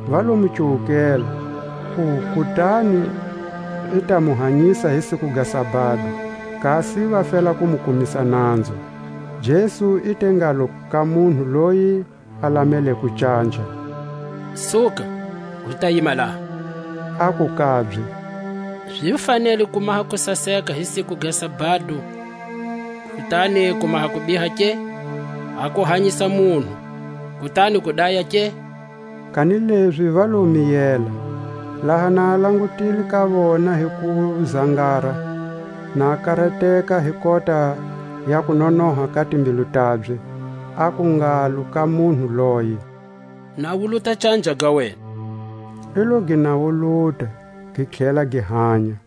Va lo mu cuwukela, ku kutani i ta mu hanyisa hi siku ga sabado, kasi va fela ku mu kumisa nanzu. Jesu i te ngalo ka munhu loyi a lameleko canja: Suka, u ta yima laha. Aku kabye: Zi fanele ku maha kusaseka hi siku ga sabado, kutani ku maha kubiha ke? A ku hanyisa munhu, kutani ku daya ke? Kanilezi va lo miyela. Laha na a langutile ka vona hi kuzangara, na karateka hi kota ya kunonoha ka timbilu tabye, aku ngalo ka munhu loye: Nawuluta canja ga wena. I lo gi nawuluta, gi tlhela gi hanya.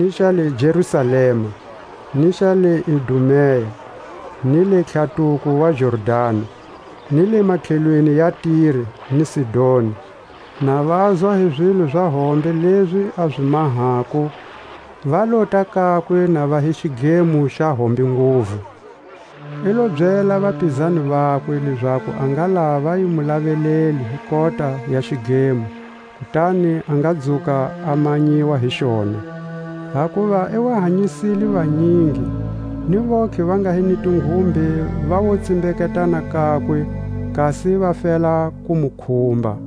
ni xa le Jerusalema, ni xa le Idumea, ni le tlhatuko wa Jordani, ni le matlhelweni ya Tire ni Sidoni; na vazwa hi zilo za hombe lezi a zi mahako va lota kakwe na va hi xidlemo xa hombe nguvu. I lo byela vapizani vakwe, lezaku a ngalava a yi mu lavelele hi kota ya xidlemo, kutani a nga dzuka a manyiwa hi xona. Hakuva i wa hanyisile vanyingi, ni vontlhe va nga hi ni tinghumbe va wo tsimbeketana kakwe, kasi va fela ku mu khumba.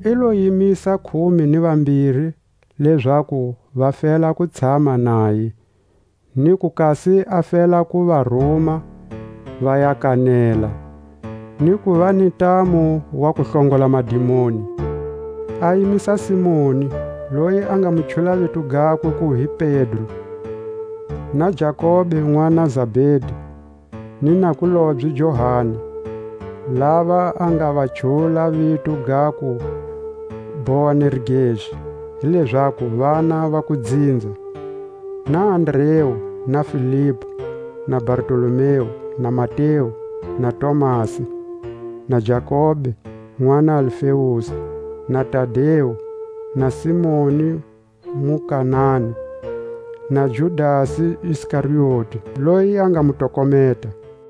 I lo yimisa khume ni vambiri lezaku va fela ku tshama naye, niku kasi a fela ku va ruma va ya kanela, ni kuva ni ntamu wa ku hlongola madimoni. A yimisa Simoni, loyi a nga mu chula vito gakwe ku hi Pedro, na Jakobe nʼwana Zabedi, ni nakulobye Johani; lava a nga va chula vito gaku Boanerges, hi lezaku vana va kudzinza; na Andreu, na Filipu, na Bartolomeu, na Mateu, na Tomasi, na Jakobe nʼwana Alfeusi, na Tadeu, na Simoni muKanani, na Judasi Iskarioti, loyi a nga mu tokometa.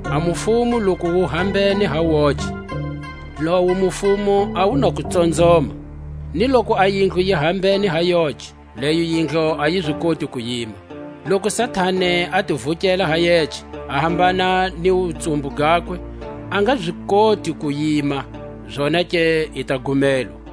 A mufumo loku wu hambene ha woce, lowo mufumo a wu na ku tsonzoma. Ni loku a yindlu yi hambene ha yoce, leyo yindlu a yi zi koti ku yima. Loku Satani a ti vukele ha yece, a hambana ni wutsumbu gakwe, a nga zi koti ku yima, zonake i ta gumelwa.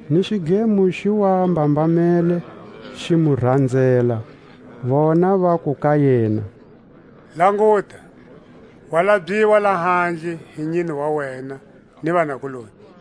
Ni xidlemo xi wa mbambamele xi mu ranzela; vona vaku ka yena: Languta, wa labyiwa lahandle hi nyine wa wena ni vanakuloni.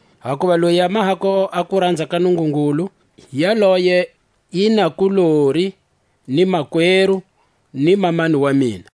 Hakuva loyi a mahako a kuranza ka Nungungulu, yaloye i nakulori, ni makweru, ni mamani wa mina.